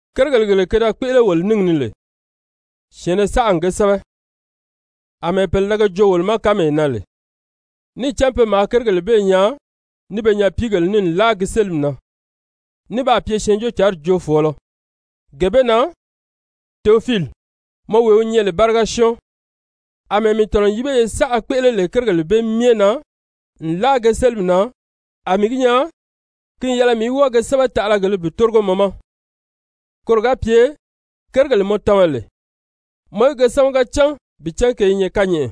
Kérigèle gele ke da kpéʔele wolo níngi ni lè, syɛ̀ɛnnɛ saʔa n ge sɛ́bɛ, àmɛɛ pèle da ge joo wolo ma kánmee na lè, níì cán pe maa kérigèle bee nyaa ní be nyapiigèle ní nlaa gi sélimi na, ní baa pye Syɛɛnjóocǎnri joofɔɔlɔ. Gee bee na, Teofiili, mɔ wee wi nyɛ lè báriga syɔ́ɔn, àmɛɛ mii tɔ̀nɔ n yíbeye saʔa kpéʔele lè kérigèle bee myɛ na nlaa ge sélimi na, a mii gi nyaa ki n yɛlɛ mii í wɔ́ɔ ge sɛ́bɛ taʔalagèlē bi tórigo mɔ ma. Koro ga pye kérigèle mɔ tama lè, mɔ í ge sámaga cán bi cán ke i nyɛ kányɛʔɛ.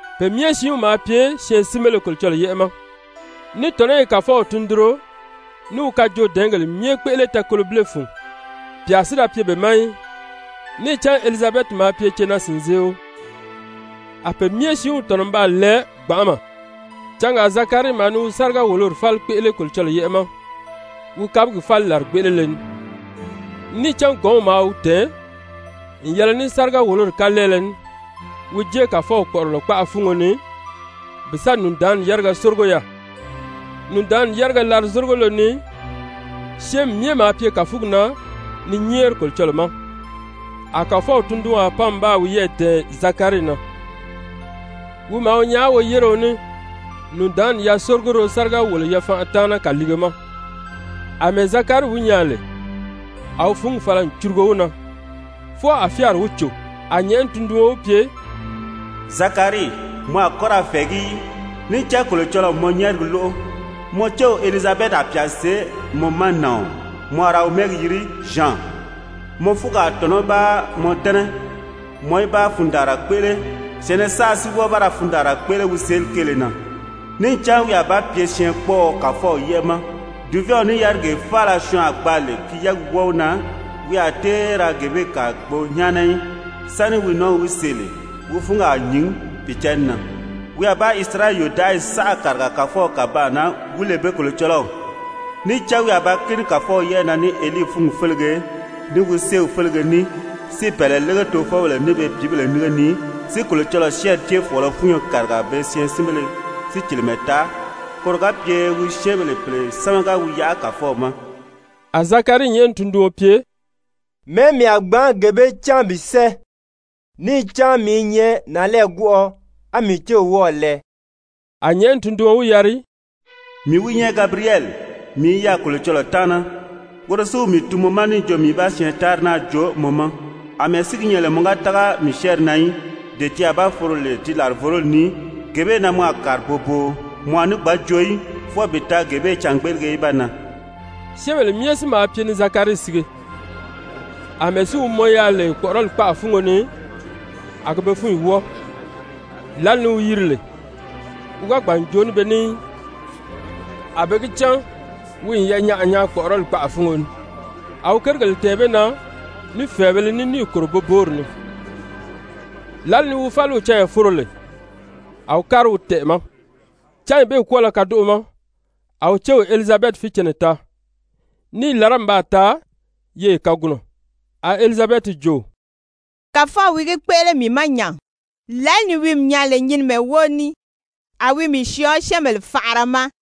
Pe myɛ siinw maa pye syɛɛnsinbéle Kolocɔlɔɔ yɛ́ʔɛ ma, ní tɔ̀nɔ́ i Kàfɔw tundunro, ní wi kajoodɛɛngèle myɛ kpéʔele tɛɛkolobile fun. Pyà si da pye be ma í. Níì cán Elizabɛti maa pye cenaa-sìnzeeo. A pe myɛ siinw tɔ̀nɔ n baa lɛɛ gbanʔama. Cangaa Zakarii maa ni wi sáriga-wòlori fáli kpéʔele Kolocɔlɔɔ yɛ́ʔɛ ma wi kabigi fáli làrigbeʔelele ni. Níì cán gɔ̌nw maa wi tɛ̀ɛn n yɛlɛ ní sáriga-wòlori kalɛɛlɛ ní, wi jée Kàfɔw kpɔ̀ʔɔrɔlɔ kpaʔa fúngo ni bi sa nùndaanni yáriga sórigo yaà. Nùndaanni yáriga larizorigolo ni syɛ́ɛnmi myɛ maa pye kàfugi na ni nyɛ́ɛri Kolocɔlɔɔ ma. A Kàfɔw tundunwaa pan n baa wiyɛɛ dɛ̀ɛn Zakarii na, wi maa wi nyaa woyéreo ní nùndaanni yasórigoro sáriga-wòlo-yafanʔa taana kàliige ma. Amɛɛ Zakarii wi nyaa lè, a wi fúngi fala n curugo wi na, fwɔɔ a fyáari wi cò. A nyɛ̀ʔɛni tunduɔn wi pye: «Zakarii, mɔ a kɔ́ ra fɛ̀ɛgí í. Níì cán Kolocɔlɔɔ n mɔ nyɛ́ɛrigi lóʔo. Mɔ céw Elizabɛti a pyà see mɔ ma nàɔn, mɔ a ra wi mɛ́ɛgi yiri Zyan. Mɔ fúngi a tɔ̀nɔ́ ba mɔ dɛ́nɛ, mɔ í da fundaanra kpéʔele, syɛ̀ɛnnɛ saʔa si wɔ́ɔ ba ra fundaanra kpéʔele wi seeli kéele na. Níì cán wi a ba pye syɛɛnkpɔɔɔ Kàfɔw yɛ́ʔɛ ma, dùvɛɛnw ní yárigee faala syɔɔn a gbaa lè ki yɛ́ɛgi wɔ́ɔ wi na, wi a tée ra gee bee kàa gbo nyáana í, sáni wi nɔ́ɔw í wi see lè, wi fúngi a nyìn Pìicǎnni na, wi a ba Isirayɛli yòdaʔayi saʔa kàriga Kàfɔw kàbaan na wi lè be Kolocɔlɔw. Níì cán wi a ba kíni Kàfɔw yɛ́ʔɛ na ní Elii fúngi félege, ní wi séew félege ní, si bɛ̀ɛlɛ lége tofɔbèle ní be pìíbèle nínge ni, si Kolocɔlɔɔ syɛ́ɛnri céefɔɔlɔ fúnyo kàriga pe syɛɛnsinbèle sícilimɛ taa, koro ga pye wi syɛ́ɛnbèle pèle sámaga wi yaʔa Kàfɔw ma.» A Zakarii nyɛ̀ʔɛni tunduɔn pye: «Mɛ̀ɛ́ mii a gbǎn gee bee cán bi sɛ́ɛ? Níì cán mii i nyɛ nànlɛɛgwɔʔɔ, a mii céw wɔ́ɔ̀ lɛɛ.» A nyɛ̀ʔɛni tunduɔn wi yari: «Mii wi nyɛ Gabiriyɛli, mii i yaà Kolocɔlɔɔ taana. Woro si wi mii tun mɔ ma níì jo mii í ba syɛɛntaanri naa joo mɔ ma. Amɛɛ si gi nyɛ lè mɔ ga tága mii syɛ́ɛnri na í, dee ti a ba foro lè di làrivoroli ni, gee bee na mɔ a kàri boboo. Mɔ a ní gbǎn joo í, fwɔɔ bi taa gee bee cângbeʔelege í ba nan.» Syɛ́ɛnbèle myɛ si maa pye ni Zakarii sige, àmɛɛ si wi mɔn yaà lè kpɔ̀ʔɔrɔli kpaʔa fúngo ni, a gi be fúnyi wɔ́ɔ. Lǎli ni wi yiri lè, wi ga gbàn n joo ní be ní í, a be gi cán wi n yanyaʔa nyaa kpɔ̀ʔɔrɔli kpaʔa fúngo ni. A wi kérigèle tɛ̀ɛn be na ní fɛ̀ɛbēle ní níì kòro boboori ni. Lǎli ni wi fáliw canya foro lè, a wi kári wi tɛʔɛ̀ ma. Cányi bee kwɔ́ɔlɔ kadoʔo ma a wi céw Elizabɛti fícɛnnɛ taa, ní i làrá n baa taa yeye kagunɔ. A Elizabɛti jo: «Kàfɔw wi gi kpéʔele mii ma nya, lǎli ni wi mii nyaa lè nyinimɛ wóo ní, a wi mii syɔɔ syɛ́ɛnbèle faʔara ma.»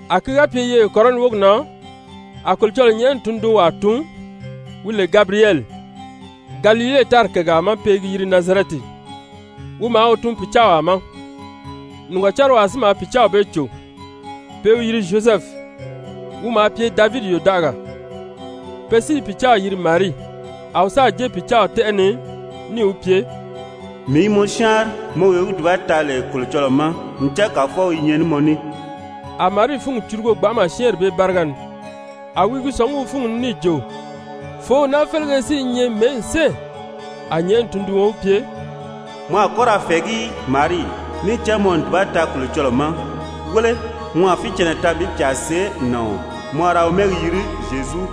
A ki ga pye yeye kɔrɔni wógi na a Kolocɔlɔɔ nyɛ̀ʔɛni tundunwaa tun, wi lè Gabiriyɛli, Galile tári kègaa ma pe i gi yiri Nazarɛti. Wi maa wi tun pìcaawaa ma, nìgɔcariwaa si maa pìcaaw bee cò, pe i wi yiri Zyozɛfu, wi maa pye Davidi yòdaʔagaa. Pe si i pìcaaw yiri Marii. A wi sáà jée pìcaaw tɛ́ʔɛ ni níì wi pye: «Mii i mɔ syáanri, mɔ wee wi dùba taa lè Kolocɔlɔɔ ma, ncan Kàfɔw i nyɛ ní mɔ ní.» A Marii fúngi curugo gbanʔama syɛ́ɛnri bee báriga ni, a wi i gi sɔ̀ngí wi fúngi ni níì jo: Fòów naa félege si i nyɛ mɛ̀ɛ́ n sɛ́ɛ? A nyɛ̀ʔɛni tunduɔn wi pye: «Mɔ a kɔ́ ra fɛ̀ɛgí í, Marii, níì cán mɔ n dùba taa Kolocɔlɔɔ ma. Wéle, mɔ a fícɛnnɛ taa bi pyà see nàɔn. Mɔ a ra wi mɛ́ɛgi yiri Zyezu.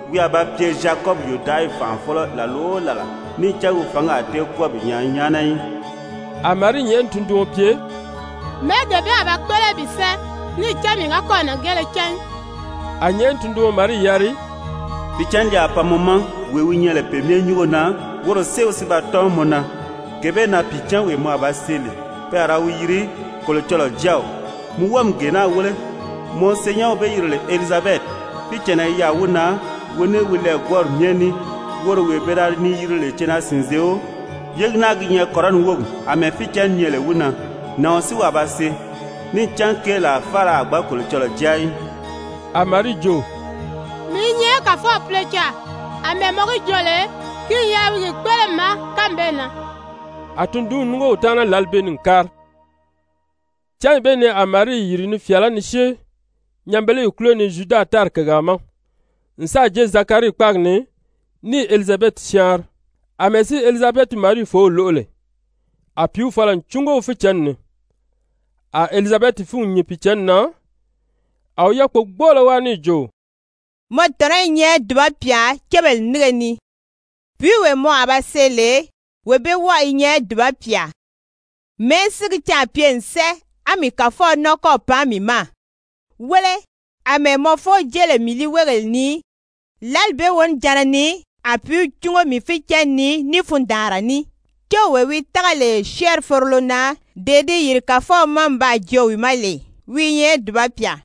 Wi a ba pye Zyakɔbi yòdaʔayi fànʔafɔlɔ làla o làla, níì cán wi fǎngi a tée kwɔ́ɔ bi nyaa nyáana í.» A Marii nyɛ̀ʔɛni tunduɔn pye: «Mɛ̀ɛ́ gee bee a ba kpéʔele bi sɛ́ɛ? Níì cán mii ga kɔ́ɔ̀ nàngeele cán í.» A nyɛ̀ʔɛni tunduɔn Marii yari: «Pìicǎnni li a pan mɔ ma, wee wi nyɛ lè Pe Myɛ Nyúngo na, woro séew si ba tɔ́n mɔ na. Gee bee na pìicǎnwee mɔ a ba see lè, pe a ra wi yiri Kolocɔlɔɔ Jáaw. Mi wɔ́ɔ mi gee naa wéle, mɔ senyɛnw be yiri lè Elizabɛti, fícɛnnɛ i yaà wi na wi ní wi lɛɛgwɔɔri myɛ ní, woro wee pe da ni yiri lè cenaa-sìnzeeo, yégi naa gi nyɛ kɔrɔni wógi àmɛɛ fícɛnni nyɛ lè wi na. Nàɔn si wi a ba see. Níì cán keelaa faala a gbǎn Kolocɔlɔɔ jáa í.» A Marii jo: «Mii i nyɛ Kàfɔw púlocaà. Amɛɛ mɔ gi joo lè, ki n yɛlɛ wi gi kpéʔele mii ma kánmi bee na.» A tundunw núngo wi taana lǎli bee ni n kári. Cányi bee ni a Marii yìri ni fyàalá ni syée nyanbeleyi kúlo ni Zyuda tári kègaa ma n sáà jée Zakarii kpáagi ni níì Elizabɛti syáanri. Amɛɛ si Elizabɛti Marii fòów lóʔo lè, a pìíw fala n cúngo wi fícɛnni ni. A Elizabɛti fúngi nyìn Pìicǎnni na, a wi yákpogbɔɔlɔ wáa níì jo: «Mɔ tɔ̀nɔ́ i nyɛ dùba pyà cébèle nínge ni, pìíwee mɔ a ba see lè, wee bee wɔ́ɔ i nyɛ dùba pyà. Mɛ̀ɛ́ si gi caà pye n sɛ́ɛ á mii Kàfɔw nɔ́ɔ kɔ́ɔ̀ pan mii ma? Wéle, àmɛɛ mɔ foow jée lè mii líiweegèle ni, lǎli bee wonijanna ni a pìíw cúngo mii fícɛnni ni ní fundaanra ní. Céwee wi tága lè syɛ́ɛnri forolo na dee di yìri Kàfɔw ma n baa joo wi ma lè, wi i nyɛ dùba pyà.»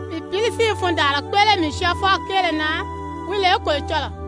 Mii pǐli si i fundaanra kpéʔele mii Syɔɔfɔw kéele na, wi lè Kolocɔlɔɔ.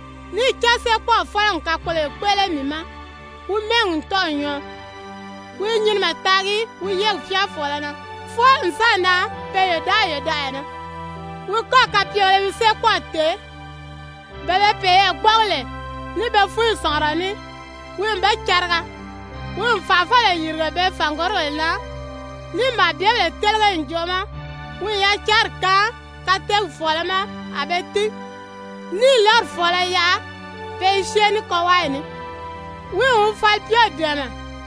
Níì cán Séekpɔɔw Fɔ́lɔ n kakpoloyo kpéʔele mii ma. Wi mɛ́ɛgi n tɔ́ɔ̀ nyɔɔ. Wi i nyinimɛ taagi wi yɛ́ɛgi fyáafɔɔlɔ na, fwɔɔ n sáà nan pe yòdaʔayi yòdaʔaya na. Wi kɔ́gi kapyegèlē i wi séekpɔɔw tèé. Bele be peyɛɛ gbɔ́ʔɔgi lè ní be fúnyi sɔ̀ngurɔ ní, wi n be cariga. Wi n fànʔafɔbèle yìrige be fàngorigèle na, níì màabyebèle télege ǹjoʔo ma. Wi n yacanri kaan kateegi fɔ̀ɔlɔ ma a be tín, níì lɔ́ri fɔ̀ɔlɔ yaʔa pe i syée ní kɔwaayi ní. Wi n wi falipyew dɛ̀ɛmɛ,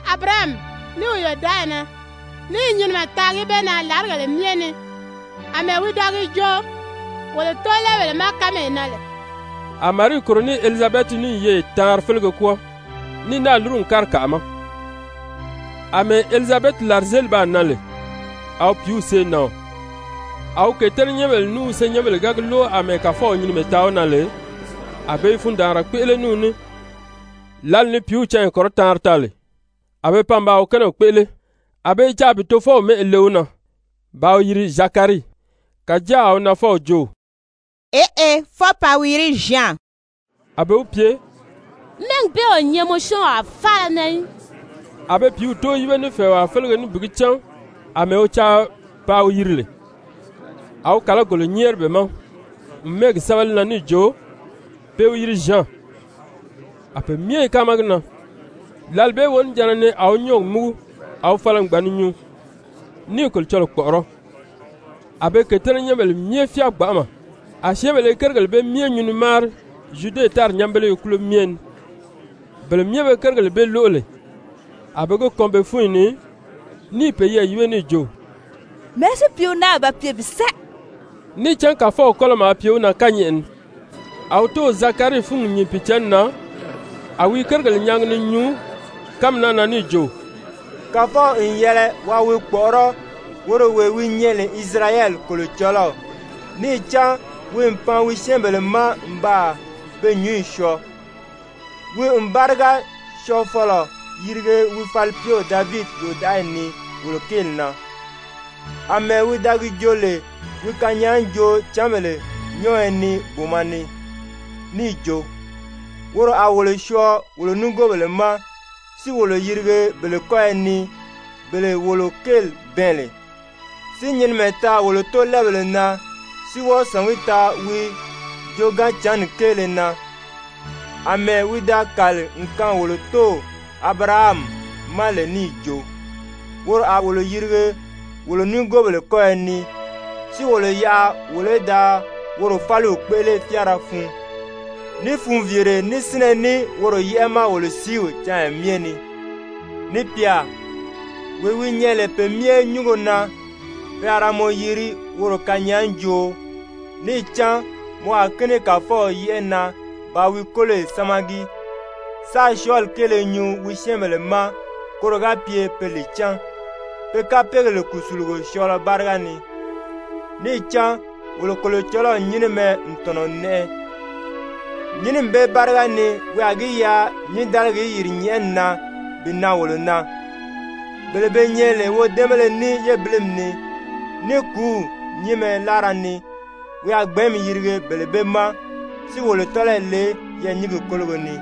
Abirahami ní wi yòdaʔayi na, ní i nyinimɛ taagi be na làrigèle myɛ ni, àmɛɛ wi da gi joo wolo tóolɛɛbèle ma kánmee na lè.» A Marii kòro ní Elizabɛti ní n yeye taanri félege kwɔ́ɔ, ní náà lúru n kári kàʔa ma. Amɛɛ Elizabɛti làrizeeli baa nan lè, a wi pìíw see nàɔn. A wi kètɛ́nɛnyɛnbèle ní wi senyɛnbèle ga gi lóʔo àmɛɛ Kàfɔw nyinimɛ taa wi na lè, a be i fundaanra kpéʔele ní wi ní. Lǎli ni pìíw canya kɔrɔtaanri taa lè, a be pan ba wi kɛ́nɛw kpéʔele. A be i caa bi tofɔw mɛ́ʔɛ le wi na bàā wi yiri Zakarii. Kàjáa a wi nafɔw jo: «Eʔe, fwɔɔ paa wi yiri Zyan.» A be wi pye: «Mɛ́ɛgi bee o nyɛ mɔ syɔ́ɔnwaa faala na í.» A be pìíw tóo yíbe ní fɛ̀ɛwaa félege ní bi gi cán àmɛɛ wi caa paa wi yiri lè. A wi kàlagolo nyɛ́ɛri be ma n mɛ́ɛgi sɛ́bɛ li na níì jo: «Pe i wi yiri Zyan.» A pe myɛ i káama gi na. Lǎli bee wonijanna ni a wi nyɔ́ɔgi múgu a wi fala n gbàn ni nyuu, ní i Kolocɔlɔɔ kpɔ̀ʔɔrɔ́. A be kètɛ́nɛnyɛnbèle myɛ fyáa gbanʔama, a syɛ́ɛnbèle i kérigèle bee myɛ nyuu ni máari Zyude tári nyanbeleye kúlo myɛ ni. Bele myɛ be kérigèle bee lóʔo lè, a be ge kɔn be fúnyi ni ní i peyɛɛ yíbe níì jo: «Mɛ̀ɛ́ si pìíw naa a ba pye bi sɛ́ɛ?» Níì cán Kàfɔw kɔ́lɔ maa pye wi na kányɛʔɛ ni. A wi tóow Zakarii fúngi nyìn Pìicǎnni na a wi i kérigèle nyaagi ni nyuu kánmi naa na níì jo: «Kàfɔw n yɛlɛ waa wi kpɔ̀ʔɔrɔ́, woro wee wi nyɛ lè Isirayɛli Kolocɔlɔw, níì cán wi n pan wi syɛ́ɛnbèle ma n baa be nyúnyi syɔɔ. Wi n báriga Syɔɔfɔlɔ yirige wi falipyew Davidi yòdaʔayi ni wolo kéeli na, àmɛɛ wi da gi joo lè wi kanyaajoocǎnbèle nyɔ́ɔyɔ ni booma ni, níì jo, woro a wolo syɔɔ wolo nigoobèle ma, si wolo yirige bele kɔ́yɔ ni, bele wolo kéeli bɛɛn lè, si nyinimɛ taa wolo tóolɛɛbèle na, si wɔ́ɔ sɔ̀ngí taa wi joogaanjǎnni kéele na, àmɛɛ wi da kàli n kaan wolo tóow Abirahami ma lè níì jo: Woro a wolo yirige wolo nigoobèle kɔ́yɔ ni, si wolo yaʔa wolo í da woro fáliw kpéʔele fyáara fun, ní funviire, ní sínnɛ ní woro yɛ́ʔɛ ma wolo sìíw canya myɛ ni. Ni pyà, wee wi nyɛ lè Pe Myɛ Nyúngo na, pe a ra mɔ yiri woro kanyaajooo. Níì cán mɔ a kíni Kàfɔw yɛ́ʔɛ na bàā wi kóloyi sámagi, sáā syɔɔli kéele nyuu wi syɛ́ɛnbèle ma koro ga pye be li cán, pe kapeegèle kùsulugo syɔɔlɔ báriga ni. Níì cán wolo Kolocɔlɔw nyínimɛ n tɔ̀nɔ n nɛʔɛ. Nyínimi bee báriga ni wi a gi yaʔa nyǐndaligi í yìri nyɛ̀ʔɛni na bi nan wolo na. Bele be nyɛ lè wodɛ́ɛnbéle ní yébilimi ni, ní kùúw nyínmɛ láara ni, wi a gbɛ̀ɛ́nmi yirige bele bee ma, si wolo tɔ́lɔyi le yɛɛ̀nyingi kólogo ni.»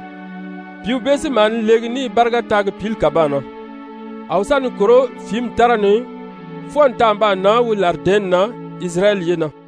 Pìíw bee si maa ni leegi ní i báriga taagi pǐli kàbaan na. A wi sa ni kòró fìími tára ni fwɔɔ n taa n baa nan wi làridɛ̀ɛ́nni na Isirayɛli ye na.